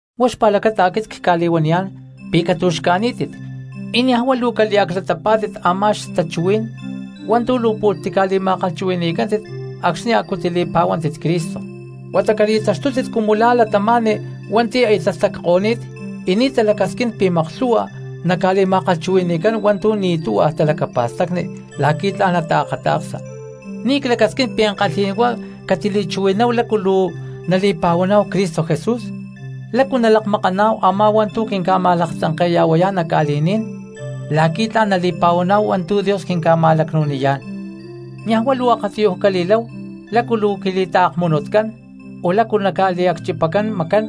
Huá xpa̠lacata aquit cca̠li̠huaniyá̠n pi̠ catu̠xca̠ní̠tit y niaj huá luu caliaclatapá̠tit a̠má xtachuhuí̠n hua̠ntu̠ luu pu̠lh tica̠li̠ma̠kalhchuhui̠ni̠cántit acxni̠ a̠cu li̠pa̠huántit Cristo, huata cali̠taxtútit cumu la̠ cristianos hua̠nti̠ aya tastacko̠ní̠t y ni̠ talacasquín pi̠ maklhu̠hua naca̠li̠ma̠kalhchuhui̠ni̠cán hua̠ntu̠ ni̠ tuhua talacapa̠stacni la̠qui̠ tla̠n nataakata̠ksa. Ni̠ clacasquín pi̠ ankalhí̠n huá catili̠chuhui̠náhu lácu luu nali̠pa̠huaná̠hu Cristo Jesús, lácu nalakmakaná̠hu a̠má hua̠ntu̠ quinca̠ma̠laktzanke̠ya̠huayá̠n nac ca̠li̠ní̠n la̠qui̠ tla̠n nali̠pa̠huaná̠hu hua̠ntu̠ Dios quinca̠ma̠lacnu̠niyá̠n. Niaj huá luu akatiyuj cali̠láhu lácu luu quili̠taakmunutcán, o lácu luu naca̠liacchipacán macán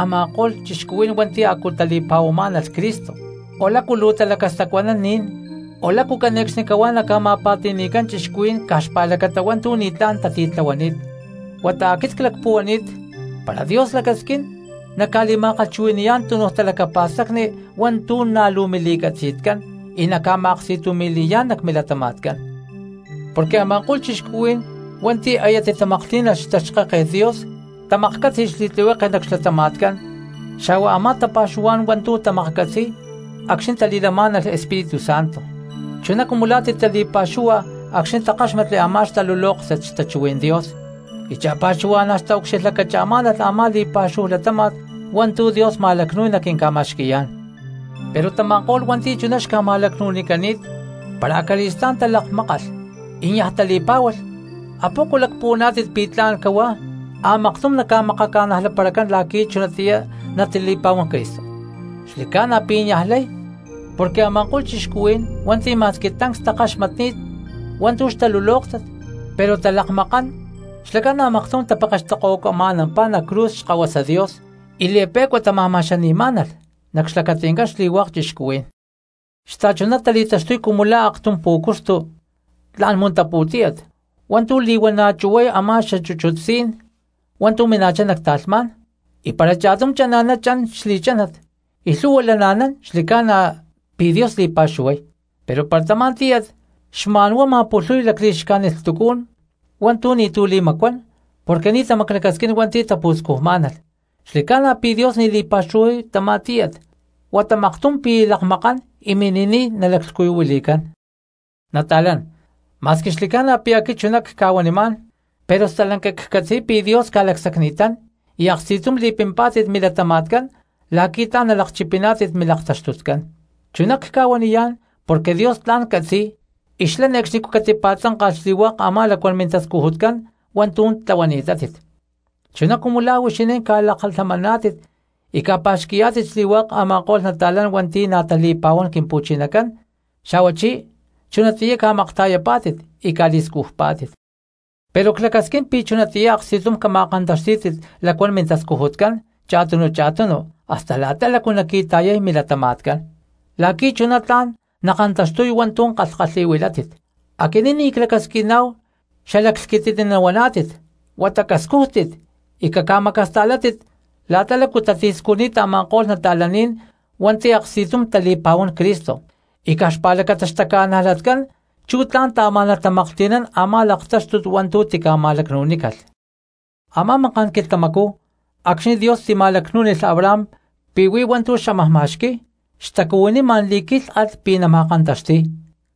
a̠ma̠ko̠lh cristianos hua̠nti̠ a̠cu tali̠pa̠huamá̠nalh Cristo, o lácu luu talacastacuanán ni̠n, o lácu caxane̠cxnicahuá naca̠ma̠pa̠ti̠ni̠cán cristianos caj xpa̠lacata hua̠ntu̠ ni̠tlán tatitlahuani̠t. Huata aquit clacpuhuani̠t, para Dios lacasquín, nacca̠li̠ma̠kalhchuhui̠ni̠yá̠n tunu talacapa̠stacni hua̠ntu̠ na̠ luu mili̠catzi̠tcán y naca̠ma̠aksti̠tumi̠li̠yá̠n nac milatama̠tcán. Porque a̠ma̠ko̠lh cristianos hua̠nti̠ aya titamaklhtí̠nalh xtaxkáket Dios, tamaklhcátzi̠lh xli̠tlihueke nac xlatama̠tcán xa̠hua a̠má tapa̠xuhuá̠n hua̠ntu̠ tamaklhcatzi̠y acxni̠ tali̠lamá̠nalh Espíritu Santo, chuná cumu la̠ titali̠pa̠xúhua acxni̠ takáxmatli a̠má xtalulóktat xtachuhuí̠n Dios y cha̠pa̠xuhua̠na̠ xtaucxilhlacacha̠má̠nalh a̠má li̠pa̠xúhu latáma̠t hua̠ntu̠ Dios ma̠lacnu̠y naquinca̠ma̠xqui̠yá̠n. Pero tama̠ko̠lh hua̠nti̠ chuná xca̠ma̠lacnu̠nicani̠t, para acali̠stá̠n talakmákalh y niaj tali̠pá̠hualh, ¿apoco lacpuhuaná̠tit pi̠ tla̠n cahuá a̠maktum naca̠makaca̠najlaparacán la̠qui̠ chunatiyá natali̠pa̠huán Cristo? Xli̠ca̠na pi̠ niaj lay porque a̠ma̠ko̠lh cristianos hua̠nti̠ ma̠squi tancs takaxmatni̠t hua̠ntu̠ xtalulóktat pero talakmakán xlacán a̠maktum tapekextokohuacama̠nampá nac cruz Xkahuasa Dios y li̠pe̠cua tama̠ma̠xani̠má̠nalh nac xlacati̠ncán xli̠hua̠k cristianos. Xta̠chuná tali̠taxtuy cumu la̠ aktum pú̠cuxtu tla̠n muntaputíyat hua̠ntu̠ li̠huana̠ chu̠huay a̠má xachúchut sí̠n hua̠ntu̠ mina̠chá nac ta̠lhmá̠n, y para cha̠tum chana̠ná chan xli̠chánat y lhu̠hua lana̠nán xli̠ca̠na pi̠ Dios li̠pa̠xuhuay. Pero para tamá tíyat xma̠n huá ma̠pulhuy lacli̠xcájnit lhtucú̠n hua̠ntu̠ ni̠tu̠ li̠macuán porque ni̠ tamaclacasquín hua̠nti̠ tapu̠scujumá̠nalh, xli̠ca̠na pi̠ Dios ni̠ li̠pa̠xuhuay tamá tíyat huata maktum pi̠ lakmakán y mini̠niy nalaclhcuyuhuili̠cán. Nata̠lán, ma̠squi xli̠ca̠na pi̠ aquit chuná cca̠huanimá̠n pero stalanca ccatzi̠y pi̠ Dios ca̠lacsacni̠tán y aksti̠tum li̠pimpá̠tit milatama̠tcán la̠qui̠ tla̠n nalakchipiná̠tit milaktaxtutcán. Chuná cca̠huaniyá̠n porque Dios tla̠n catzi̠y y xlá ne̠cxnicú catipa̠tzánka̠lh xli̠hua̠k a̠má lacuán mintascujutcán hua̠ntu̠ tlahuani̠tátit, chuná cumu la̠ huixinín ca̠lakalhamaná̠tit y ca̠pa̠xqui̠yá̠tit xli̠hua̠k a̠ma̠ko̠lh nata̠lán hua̠nti̠ na̠ tali̠pa̠huán Quimpu̠chinacán, xa̠huachí chunatiyá ca̠makta̠yapá̠tit y ca̠li̠scujpá̠tit. Pero clacasquín pi̠ chunatiyá aksti̠tum cama̠kantaxtí̠tit lacuán mintascujutcán cha̠tunu cha̠tunu hasta la̠ta lácu naqui̠ta̠yay milatama̠tcán, la̠qui̠ chuná tla̠n nakantaxtuy hua̠ntu̠ kalhkalhi̠huilátit. Aquinín ni̠ clacasquiná̠hu xalaclhquititni nahuaná̠tit huata cascújtit y caca̠macasta̠látit la̠ta lácu tatiscujni̠t a̠ma̠ko̠lh cristianos hua̠nti̠ aksti̠tum tali̠pa̠huán Cristo, y caj xpa̠lacata xtaca̠najlatcán chú tla̠n taamá̠nalh tamaklhti̠nán a̠má laktáxtut hua̠ntu̠ tica̠ma̠lacnu̠nícalh. Amá maká̠n quilhtamacú acxni̠ Dios tima̠lacnú̠nilh Abraham pi̠ huí hua̠ntu̠ xámaj ma̠xqui̠y xtacuhuiní ma̠n li̠quílhalh pi̠ nama̠kantaxti̠y,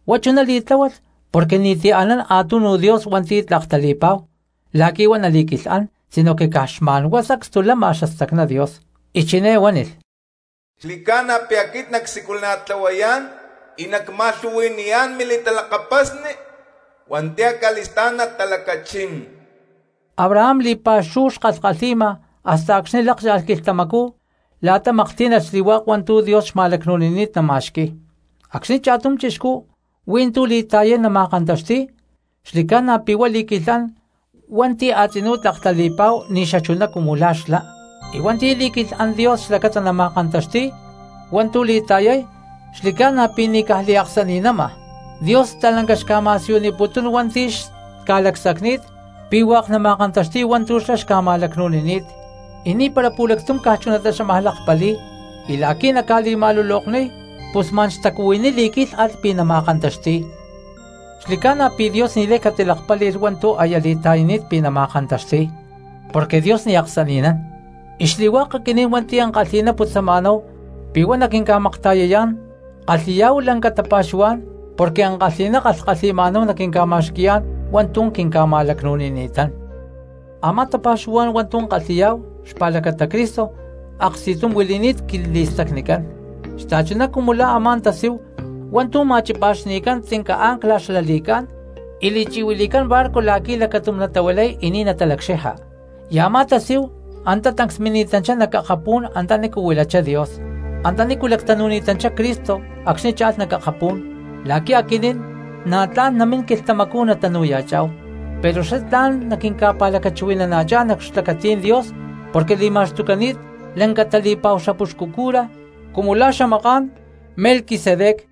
huá chuná li̠tláhualh porque ni̠ti̠ anán a̠tunu Dios hua̠nti̠ tlak tali̠pa̠hu la̠qui̠ huá nali̠quilhán sinoque caj xma̠n huá sacstu lama xastacná Dios. Y chiné huánilh: “Xli̠ca̠na pi̠ aquit nacsiculana̠tlahuayá̠n y nacma̠lhu̠hui̠niyá̠n mili̠talakapasni hua̠nti̠ acali̠stá̠n natalacachín.” Abraham li̠pa̠xúhu xkalhkalhi̠ma hasta acxni̠ lákcha̠lh quilhtamacú la̠ta maklhtí̠nalh xli̠hua̠k hua̠ntu̠ Dios xma̠lacnu̠nini̠t nama̠xqui̠y. Acxni̠ cha̠tum chixcú hui̠ntú li̠ta̠yay nama̠kantaxti̠y, xli̠ca̠na pi̠ huá li̠quilhán hua̠nti̠ a̠tzinú tlak tali̠pa̠hu ni̠ xachuná cumu la̠ xlá, y hua̠nti̠ li̠quilhán Dios xlacata nama̠kantaxti̠y hua̠ntu̠ li̠ta̠yay xli̠ca̠na pi̠ ni̠ caj liaksani̠nama. Dios stalanca xca̠ma̠siyuniputún hua̠nti̠ xca̠lacsacni̠t pi̠ hua̠k nama̠kantaxti̠y hua̠ntu̠ xlá xca̠ma̠lacnu̠nini̠t y ni̠para pu̠lactum caj chunatá xámaj lakpali̠y, y la̠qui̠ naca̠li̠ma̠lulokniy pus ma̠n xtacuhuiní li̠quílhalh pi̠ nama̠kantaxti̠y. Xli̠ca̠na pi̠ Dios ni̠lay catilakpáli̠lh hua̠ntu̠ aya li̠ta̠yani̠t pi̠ nama̠kantaxti̠y porque Dios ni̠ aksani̠nán, y xli̠hua̠k aquinín hua̠nti̠ ankalhi̠ná putzama̠náhu pi̠ huá naquinca̠makta̠yayá̠n kalhi̠yá̠hu lanca tapa̠xuhuá̠n porque ankalhi̠ná kalhkalhi̠ma̠náhu naquinca̠ma̠xqui̠yá̠n hua̠ntu̠ quinca̠ma̠lacnu̠nini̠tán. Amá tapa̠xuhuá̠n hua̠ntu̠ kalhi̠yá̠hu xpa̠lacata Cristo aksti̠tum huili̠ni̠t quili̠stacnicán xta̠chuná cumu la̠ a̠má tasíhu hua̠ntu̠ chi̠pa̠xni̠cán tzinca ancla xla li̠cá̠n y li̠chi̠huili̠cán barco la̠qui̠ lacatum natahuilay y ni̠ natalacxija, y a̠má tasíhu antá tancs mini̠tanchá nac akapú̠n antanícu huilachá Dios, antanícu lactanu̠ni̠tanchá Cristo acxni̠ cha̠lh nac akapú̠n la̠qui̠ aquinín na̠ tla̠n namín quilhtamacú nacha̠ná̠hu, pero xlá tla̠n naquinca̠pa̠lacachuhui̠nana̠chá̠n nac xlacatí̠n Dios porque li̠ma̠xtucani̠t lanca tali̠pa̠hu xapuxcu cura cumu la̠ xamaká̠n Melquisedec.